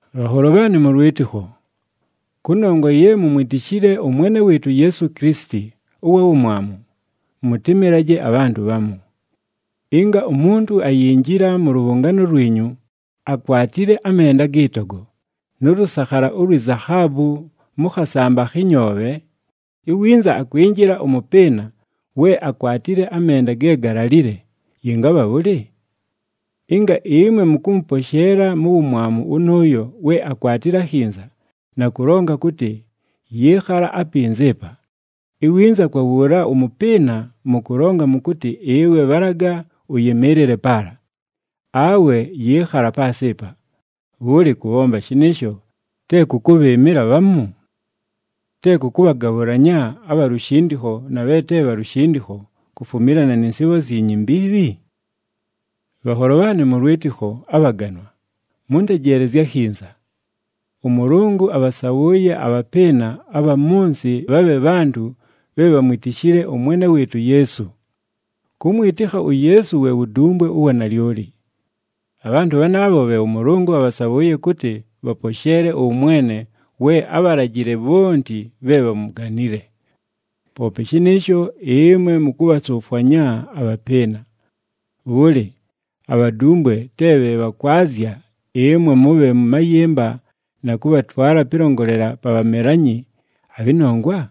Bhanholo bhaanɨ mʉ lwɨtɨkho, kʉnongwa ye mumwitishile ʉMwene wɨɨtʉ uYeesu Kilisiti ʉwa Wumwamu, mʉtɨmɨlaje abhantʉ bhamu. Ɨnga umuntu ayinjila mʉ lʉbhʉngaano lwinyu, akwatile amenda agɨ togo, nʉ lʉsakhala ulwi zahaabu mʉ khasamba akhɨ nyoobhe, iwinza akwinjila ʉmʉpɨɨna, we akwatile amenda ge galalile, yɨngabha bhʉlɨ? Ɨnga ɨmwe mʉkʉmʉposheela mu wumwamu wʉnʉʉyo we akwatile akhinza, na kʉlonga kʉtɨ, “Yɨɨkhala apinza ɨpa,” iwinza kwa wʉʉla ʉmʉpɨɨna mʉkʉlonga mʉkʉtɨ, “Ɨwe, bhalaga ʉyɨmɨɨlɨle paala,” awe “Yɨɨkhala paasɨ ɨpa,” bhʉlɨ, kʉbhomba shɨnɨɨsho, te kʉ kʉbhɨɨmɨla bhamu? Te kʉ kʉbhagabhʉlanya abha lushindikho na bhe te bha lushindikho kufumilana nɨ nsɨɨbho zyinyu imbiibhi? Bhanholo bhaanɨ mʉ lwɨtɨkho abhaganwa, mʉntejeelezye akhinza! ɄMʉlʉngʉ abhasabhʉʉye abhapɨɨna abha mʉ nsɨ bhabhe bhantʉ bhe bhamwitishile ʉMwene wɨɨtʉ uYeesu. Kʉmwɨtɨkha uYeesu we wudumbwe ʉwa nalyoli. Abhantʉ bhanaabho bhe ʉMʉlʉngʉ abhasabhʉʉye kʉtɨ bhaposheele ʉwʉmwene we ábhalajile bhonti bhe bhamuganile. Poope shɨnɨɨsho ɨmwe mʉkʉbhasʉfwanya abhapɨɨna! Bhʉlɨ, abhadumbwe te bhe bhakwazya ɨmwe mʉbhe mʉ mayɨmba na kʉbhatwala pɨlongolela pa bhamelanyi abhɨ nongwa?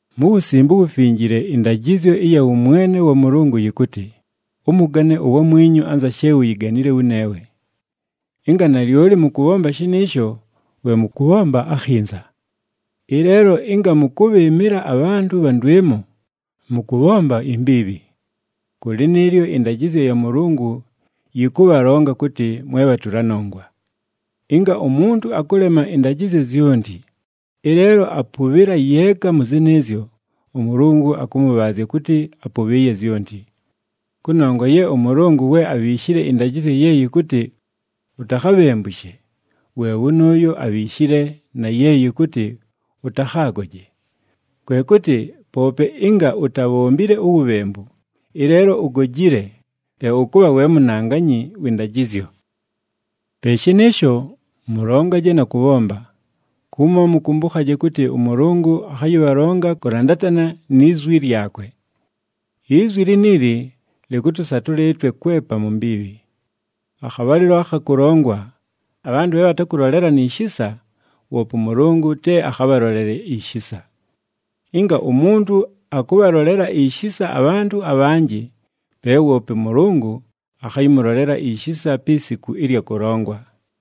Mu Wusimbe uWufinjile ɨndajɨzyo ɨya wʉmwene wa Mʉlʉngʉ yɨkʉtɨ, “Ʉmʉgane uwamwinyu anza she uyiganile wʉneewe.” Ɨnga nalyoli mʉkʉbhomba shɨnɨɨsho, we mʉkʉbhomba akhinza. Ɨleelo, ɨnga mʉkʉbhɨɨmɨla abhantʉ bha ndwɨmo, mʉkʉbhomba imbiibhi. Kʉ lɨnɨɨlyo, ɨndajɨzyo ya Mʉlʉngʉ yɨkʉbhalonga kʉtɨ mwe bhatʉla nongwa. Ɨnga umuntu akʉlema ɨndajɨzyo zyonti, ɨleelo apʉbhɨla yeeka mʉ zɨnɨɨzyo, ʉMʉlʉngʉ akʉmʉbhaazya kʉtɨ apʉbhɨɨye zyonti. Kʉnongwa ye ʉMʉlʉngʉ we abhiishile ɨndajɨzyo ye yɨkʉtɨ, “Utakhabhembushe,” we wʉnʉʉyo abhiishile na ye yɨkʉtɨ, “Ʉtakhaagoje.” Kwe kʉtɨ, poope ɨnga utabhombile uwubhembu, ɨleelo ugojile, pe ʉkʉbha we munanganyi wɨ ndajɨzyo. Pe shɨnɨɨsho, mʉlongaje na kʉbhomba, kumo mʉkʉmbʉkhaje kʉtɨ ʉMʉlʉngʉ akhayɨbhalonga kʉlandatana ni zwi lyakwe. Izwi liniili lɨkʉtʉsatʉla ɨtwe kwepa mu mbiibhi. Akhabhalɨlo akha kʉlongwa, abhantʉ bhe bhatakʉlolelana ishisa, woope ʉMʉlʉngʉ te akhabhalolele ishisa. Ɨnga umuntu akʉbhalolela ishisa abhantʉ abhanjɨ, pe woope ʉMʉlʉngʉ akhayɨmʉlolela ishisa pi siku ɨlya kʉlongwa.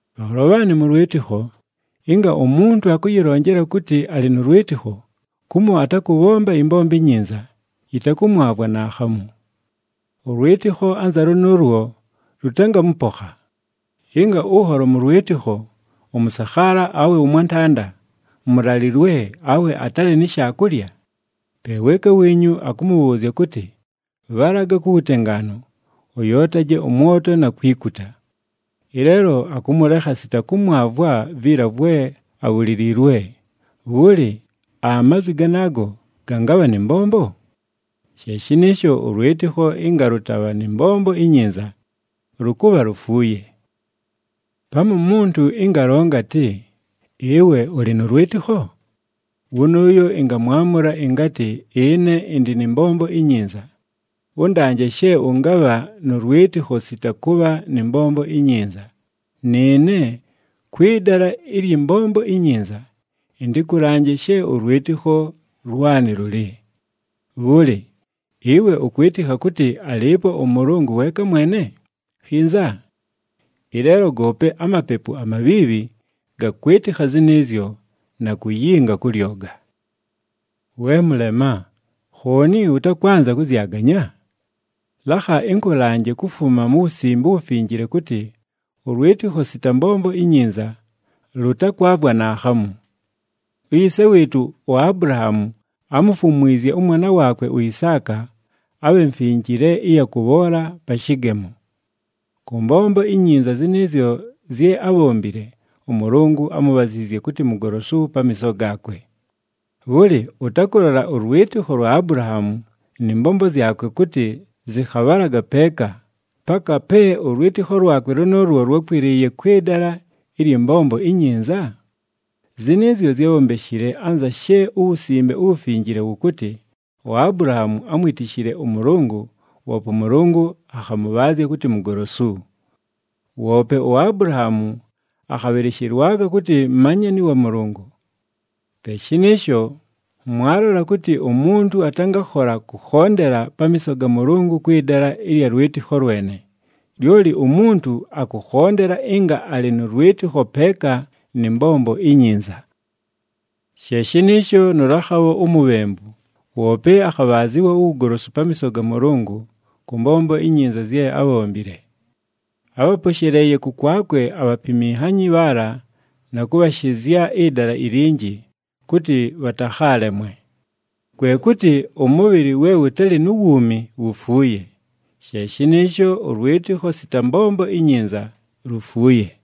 Bhanholo bhaanɨ mʉ lwɨtɨkho, ɨnga umuntu akʉyɨlonjela kʉtɨ alɨ nʉ lwɨtɨkho, kumo atakʉbhomba ɨmbombo inyinza, yɨtakʉmwavwa naakhamu! Ʉlwɨtɨkho anza lʉnʉʉlwo lʉtangamʉpokha. Ɨnga ʉnholo mʉ lwɨtɨkho, ʉmʉsakhaala awe ʉmwantanda, mʉlalɨlwe, awe atalɨ ni shaakulya, pe weeka wiinyu akʉmʉbhʉʉzya kʉtɨ, “Bhalaga ku wutengaanu, ʉyootaje ʉmwoto na kwikuta,” ɨleelo akʉmʉlekha sita kʉmwavwa viila vwe abhuliliilwe, bhʉlɨ, amazwi ganaago gangabha nɨ mbombo? She shɨnɨɨsho, ʉlwɨtɨkho ɨnga lʉtabha nɨ mbombo inyinza, lʉkʉbha lufuuye. Pamu umuntu ɨnga alonga atɨ, “Ɨwe ʉlɨ nʉ lwɨtɨkho?” Wʉnʉʉyo ɨngamwamʉla ɨngatɨ, “Ɨne ɨndɨ nɨ mbombo inyinza. Ʉndanje she ʉngabha nʉ lwɨtɨkho sita kʉbha nɨ mbombo inyinza, nɨɨne, kwɨ dala ɨlyɨ mbombo inyinza, ɨntɨkʉlanje she ʉlwɨtɨkho lwanɨ lʉlɨ.” Bhʉlɨ, ɨwe ʉkwɨtɨkha kʉtɨ alɨɨpo ʉMʉlʉngʉ weeka mwene? Khinza! Ɨleelo goope amapepu amabhiibhi gakwɨtɨkha zɨnɨɨzyo na kuyinga kʉ lyoga. We mʉlema! Khooni ʉtakwanza kʉzyaganya? Lakha ɨnkʉlanje kufuma mu Wusimbe uWufinjile kʉtɨ ʉlwɨtɨkho sita mbombo inyinza, lʉtakwavwa naakhamu! Uyise wɨɨtʉ uAbulahaamu, ámufumwizye ʉmwana waakwe uIsaaka, abhe mfinjile ɨya kʉbhoola pa shɨgemo. Kʉ mbombo inyinza zɨnɨɨzyo zye ábhombile, ʉMʉlʉngʉ ámubhaziizye kʉtɨ mugolosu pamiiso gaakwe! Bhʉlɨ, ʉtakʉlola ʉlwɨtɨkho lwa Abulahaamu nɨ mbombo zyakwe kʉtɨ zɨkhabhalaga peeka, paka pe ʉlwɨtɨkho lwakwe lʉnʉʉlwo lwákwɨlɨɨye kwɨ dala ɨlyɨ mbombo inyinza? Zɨnɨɨzyo zyábhombeshile, anza she uWusimbe uWufinjile wʉkʉtɨ, “UAbulahaamu ámwitishile ʉMʉlʉngʉ, woope ʉMʉlʉngʉ akhamʉbhaazya kʉtɨ mugolosu.” Woope uAbulahaamu akhabhɨlɨshɨlwaga kʉtɨ manyani wa Mʉlʉngʉ. Pe shɨnɨɨsho mwalola kʉtɨ umuntu atangakhola kʉkhondela pamiiso ga Mʉlʉngʉ kwɨ dala ɨlya lwɨtɨkho lwene. Lyoli umuntu akʉkhondela ɨnga alɨ nʉ lwɨtɨkho peeka nɨ mbombo inyinza. She shɨnɨɨsho nʉ Lakhabho umubhembu, woope akhabhaazɨwa uwugolosu pamiiso ga Mʉlʉngʉ, kʉ mbombo inyinza zye ábhombile. Ábhaposheleeye kʉkwakwe abhapiminhanyi bhaala na kʉbhashɨzya ɨdala ilinji, kʉtɨ bhatakhaalemwe. Kwe kʉtɨ ʉmʉbhɨlɨ we wʉtalɨ nu wuumi wufuuye, she shɨnɨɨsho ʉlwɨtɨkho sita mbombo inyinza lufuuye.